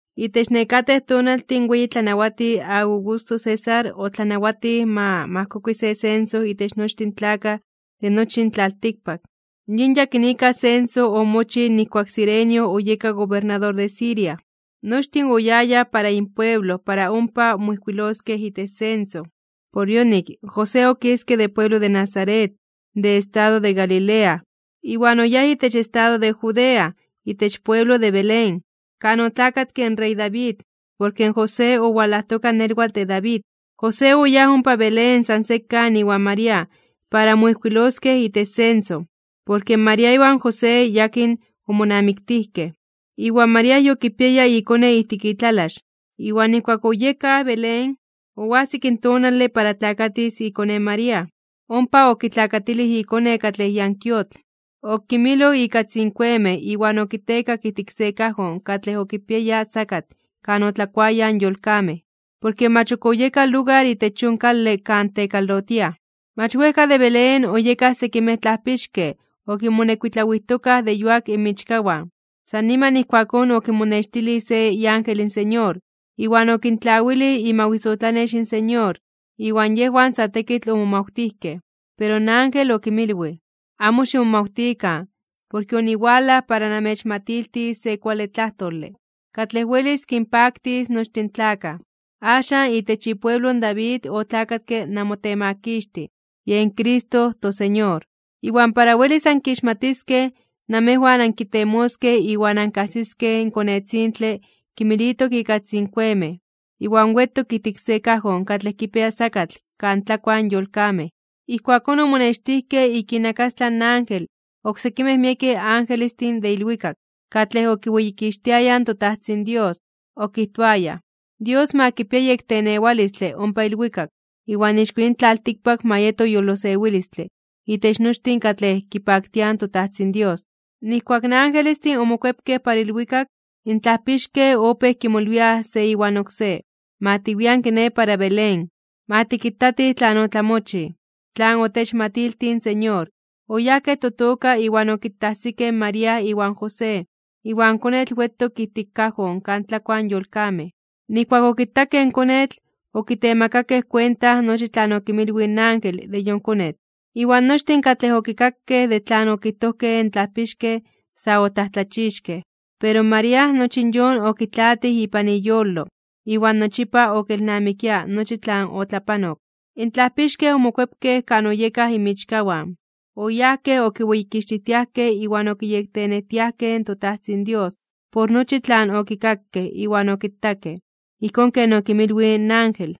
Itech nekatej tonaltin in weyi tlanawatij Augusto César otlanawatij ma majkokui se censo itech nochtin in tlakaj de nochi in tlaltikpak. Yin yakinika censo omochij nijkuak Cirenio oyeka gobernador de Siria. Nochtin oyayaj para inpueblo para ompa moijkuiloskej itech censo. Por yonik, in José okiske de pueblo de Nazaret, de estado de Galilea, iwan oyáj itech estado de Judea, itech pueblo de Belén, kan otlakatke in rey David, porke in José owalajtoka nelwatl de David. José oyáj ompa Belén san sekan iwan María para moijkuiloskej itech censo. Porke María iwan José yakin omonamiktijkej, iwan María yokipiaya ikone ijtik itlalax. Iwan nijkuak oyekaj Belén, oajsik in tonale para tlakatis ikone in María. Ompa okitlakatilij ikone katlej yankuiotl, okimiloj ika tzinkuemej iwan okitekak ijtik se kajon katlej okipiaya sakatl kan otlakuayaj in yolkamej. Porke mach ok oyeka lugar itech yon kale kan tekalotiaj. Mach wejka de Belén oyekaj sekimej tlajpixkej okinmonekuitlawijtokaj de yuak inmichkawan. San niman ijkuakón okinmonextilij se iángel in Señor, iwan okintlawilij imawisotlanex in Señor, iwan yejwan sa tekitl omomawtijkej. Pero in ángel okinmilwij: ―Amo ximomawtikan, porke oniwalaj para namechmatiltis se kuale tlajtole, katlej welis kinpaktis nochtin in tlakaj. Axan itech ipueblo in David otlakatke namoTemakixtij, yen Cristo in toSeñor. Iwan para welis ankixmatiskej, namejwan ankitemoskej iwan ankajsiskej in konetzintle kimilitok ika tzinkuemej, iwan wetok ijtik se kajon katlej kipia sakatl kan tlakuaj in yolkamej. Ijkuakón omonextijkej ik inakastlan ángel, oksekimej miekej angelestin de ilwikak, katlej okiweyikixtiayaj in toTajtzin Dios. Okijtoayaj: Dios ma kipia yektenewalistle ompa ilwikak, iwan ixko yin tlaltikpak ma yeto yolosewilistle itech nochtin katlej kipaktiaj in toTajtzin Dios. Nijkuak in angelestin omokuepkej para ilwikak, in tlajpixkej opéj kimolwiaj se iwan oksé: ―Ma tiwian kiné para Belén. Ma tikitatij tlan otlamochij, tlan otechmatiltij in Señor. Oyajkej totoka iwan okitajsikej in María iwan José, iwan konetl wetok ijtik kajon kan tlakuaj in yolkamej. Nijkuak okitakej in konetl, okitemakakej kuenta nochi tlan okinmilwij in ángel de yon konetl, iwan nochtin katlej okikakej de tlan okijtojkej in tlajpixkej sa otlajtlachixkej (omomajmawtijkej). Pero María nochi in yon okitlaatij ipan iyolo, iwan nochipa okelnamikia nochi tlan otlapanok. In tlajpixkej omokuepkej kan oyekaj inmichkawan. Oyajkej okiweyikixtijtiajkej iwan okiyektenejtiajkej in toTajtzin Dios por nochi tlan okikakej iwan okitakej, ijkón ken okinmilwij in ángel.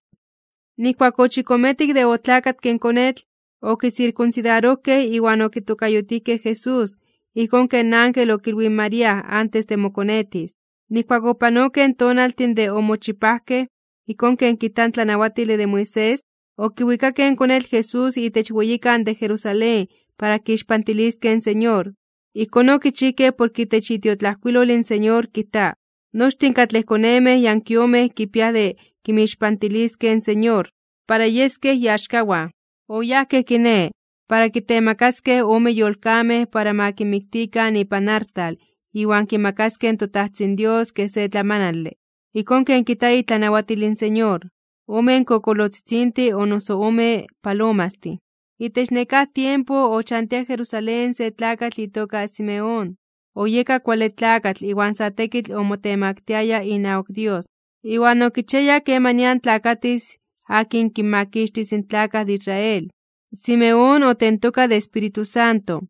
Nijkuak ochikometik de otlakatke in konetl, okisirkunsidarojkej iwan okitokayotijkej Jesús, ijkón ken ángel okilwij in María antes de mokonetis. Nijkuak opanokej in tonaltin de omochipajkej, ijkón ken kijta in tlanawatile de Moisés, okiwikakej in konetl Jesús itech weyikan de Jerusalén para kixpantiliskej in Señor. Ijkón okichijkej porke itech itiotlajkuilol in Señor kijta: “Nochtin katlej konemej yankuiomej kipiaj de kinmixpantiliskej in Señor para yeskej iaxkawan.” Oyajkej kiné, para kitemakaskej ome yolkamej para ma kinmiktikan ipan artal iwan kimakaskej toTajtzin Dios kej se tlamanale, ijkón ken kijta itlanawatil in Señor, omen kokolotzitzintin o noso omen palomastin. Itech nekáj tiempo ochantia Jerusalén se tlakatl itoka Simeón. Oyeka kuale tlakatl iwan sa tekitl omotemaktiaya inawak Dios, iwan okichiaya kemanian tlakatis akin kinmakixtis in tlakaj de Israel. Simeón otentoka de Espíritu Santo,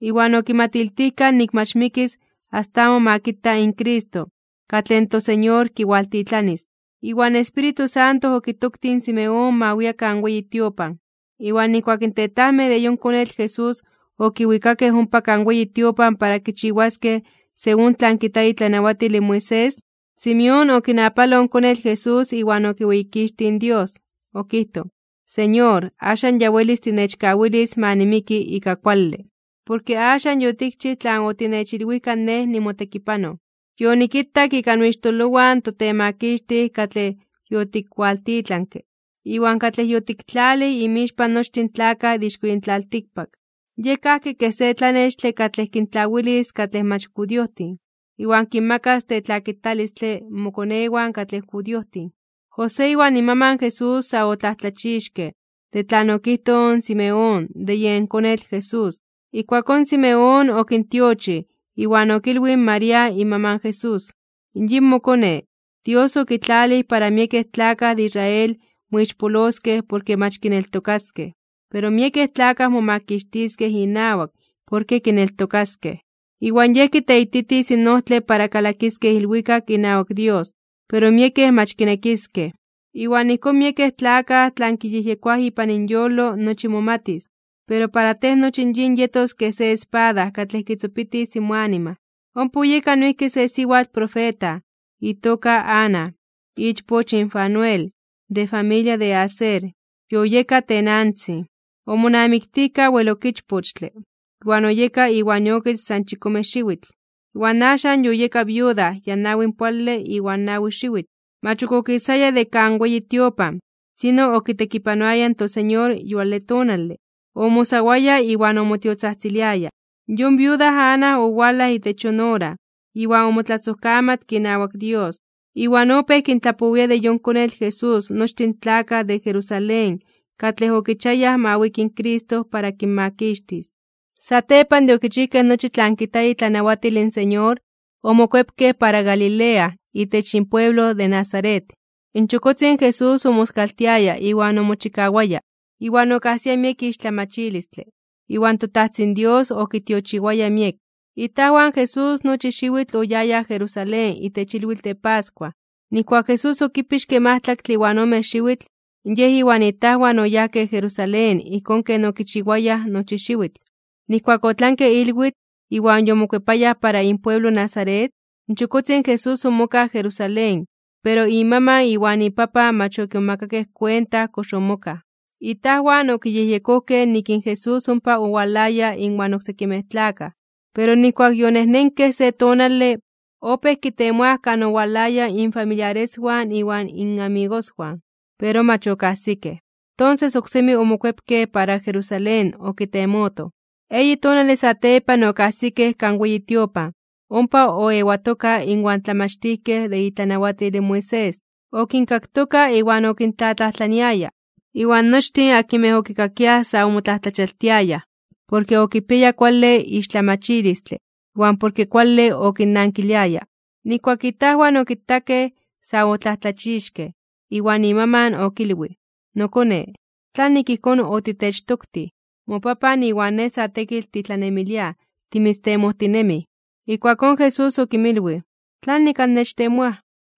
iwan okimatiltijka nik mach mikis asta amo ma kita in Cristo, katlej toSeñor kiwaltitlanis. Iwan in Espíritu Santo okitoktij in Simeón ma wia kan weyi tiopan. Iwan nijkuak in tetajmej de yen konetl Jesús okiwikakej ompa kan weyi tiopan para kichiwaskej según tlan kijta itlanawatil in Moisés, Simeón okinapaloj in konetl Jesús iwan okiweyikixtij in Dios. Okijtoj: Señor, axan ya welis tinechkawilis ma nimiki ika kuale, porke axan yotikchij tlan otinechilwijka nej nimotekipanoj. Yonikitak ika noixtololowan in toTemakixtij katlej yotikkualtitlanke, iwan katlej yotiktlalij inmixpan nochtin in tlakaj de ixko yin tlaltikpak. Yej kajki kej se tlanextle katlej kintlawilis katlej mach judiojtin, iwan kinmakas tetlakitalistle mokonewan katlej judiojtin. José iwan imaman Jesús sa otlajtlachixkej (omomajmawtijkej) de tlan okijtoj in Simeón de yen konetl Jesús. Ijkuakón Simeón okintiochij, iwan okilwij in María imaman in Jesús: ―Yin mokone, Dios okitlalij para miekej tlakaj de Israel moixpoloskej porke mach kineltokaskej. Pero miekej tlakaj momakixtiskej inawak porke kineltokaskej. Iwan Yej kiteititis in ojtle para kalakiskej ilwikak inawak Dios, pero miekej mach kinekiskej. Iwan ijkón miekej tlakaj tlan kiyejyekoaj ipan inyolo nochi momatis. Pero para tej nochi in yin yetos kej se espada katlej kitzopitis moanima. Ompa oyeka noijki se siwatl profeta, itoka Ana, ichpoch in Fanuel, de familia de Aser. Yoyeka tenantzin. Omonamiktijka wel ok ichpochtle, iwan oyeka iwan iokich san chikome xiwitl, iwan axan yoyeka viuda ya nawinpoale iwan nawi xiwitl. Mach okisaya de kan weyi tiopan, sino okitekipanoaya in toSeñor yuale tonale, omosawaya (oayunaroaya) iwan omotiotzajtziliaya. Yon viuda Ana owalaj itech yon ora, iwan omotlasojkamatke inawak Dios. Iwan opéj kintlapowia de yon konetl Jesús nochtin in tlakaj de Jerusalén katlej okichiayaj ma wiki in Cristo para kinmakixtis. Satepan de okichijkej nochi tlan kijta itlanawatil in Señor, omokuepkej para Galilea, itech inpueblo de Nazaret. In chokotzin Jesús omoskaltiaya iwan omochikawaya, iwan okajsia miek ixtlamachilistle. Iwan toTajtzin Dios okitiochiwaya miek. Itajwan in Jesús nochi xiwitl oyayaj Jerusalén itech ilwitl de pascua. Nijkuak Jesús okipixke majtlaktle iwan ome xiwitl, Yej iwan itajwan oyajkej Jerusalén ijkón ken okichiwayaj nochi xiwitl. Nijkuak otlanke ilwitl, iwan yomokuepayaj para inpueblo Nazaret, in chokotzin Jesús omokaj Jerusalén, pero imaman iwan ipapan mach okimomakakej kuenta kox omokaj. Itajwan okiyejyekojkej nik in Jesús ompa owalaya inwan oksekimej tlakaj. Pero nijkuak yonejnenkej se tonale, opéj kitemoaj kan owalayaj infamiliareswan iwan inmamigoswan, pero mach okajsikej. Tonses oksemi omokuepkej para Jerusalén okitemotoj. Eyi tonale satepan okajsikej kan weyi tiopan, ompa oewatoka inwan tlamachtijkej de itlanawatil in Moisés, okinkaktoka iwan okintlatlajtlaniaya. Iwan nochtin akinmej okikakiaj sa omotlajtlachialtiayaj (omomajmawtiayaj) porke okipiaya kuale ixtlamachilistle iwan porke kuale okinnankiliaya. Nijkuak itajwan okitakej, sa otlajtlachixkej. Iwan imaman okilwij: ―Nokone, ¿tlanik ijkón otitechtoktij? Mopapan iwan nej sa tekitl titlanemiliaj timitztemojtinemij. Ijkuakón Jesús okinmilwij: ―¿Tlanik annechtemoaj?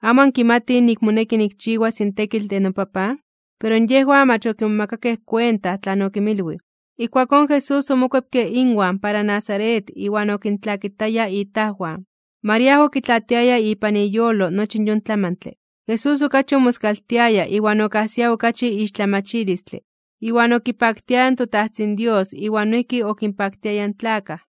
¿Amo ankimatij nik moneki nikchiwas in tekitl de noPapan? Pero yejwan mach okimomakakej kuenta tlan okinmilwij. Ijkuakón Jesús omokuepke inwan para Nazaret iwan okintlakitaya itajwan. María okitlaatiaya ipan iyolo nochi yon tlamantle. Jesús okachi omoskaltiaya iwan okajsia okachi ixtlamachilistle, iwan okipaktiaya in toTajtzin Dios iwan noijki okinpaktiaya in tlakaj.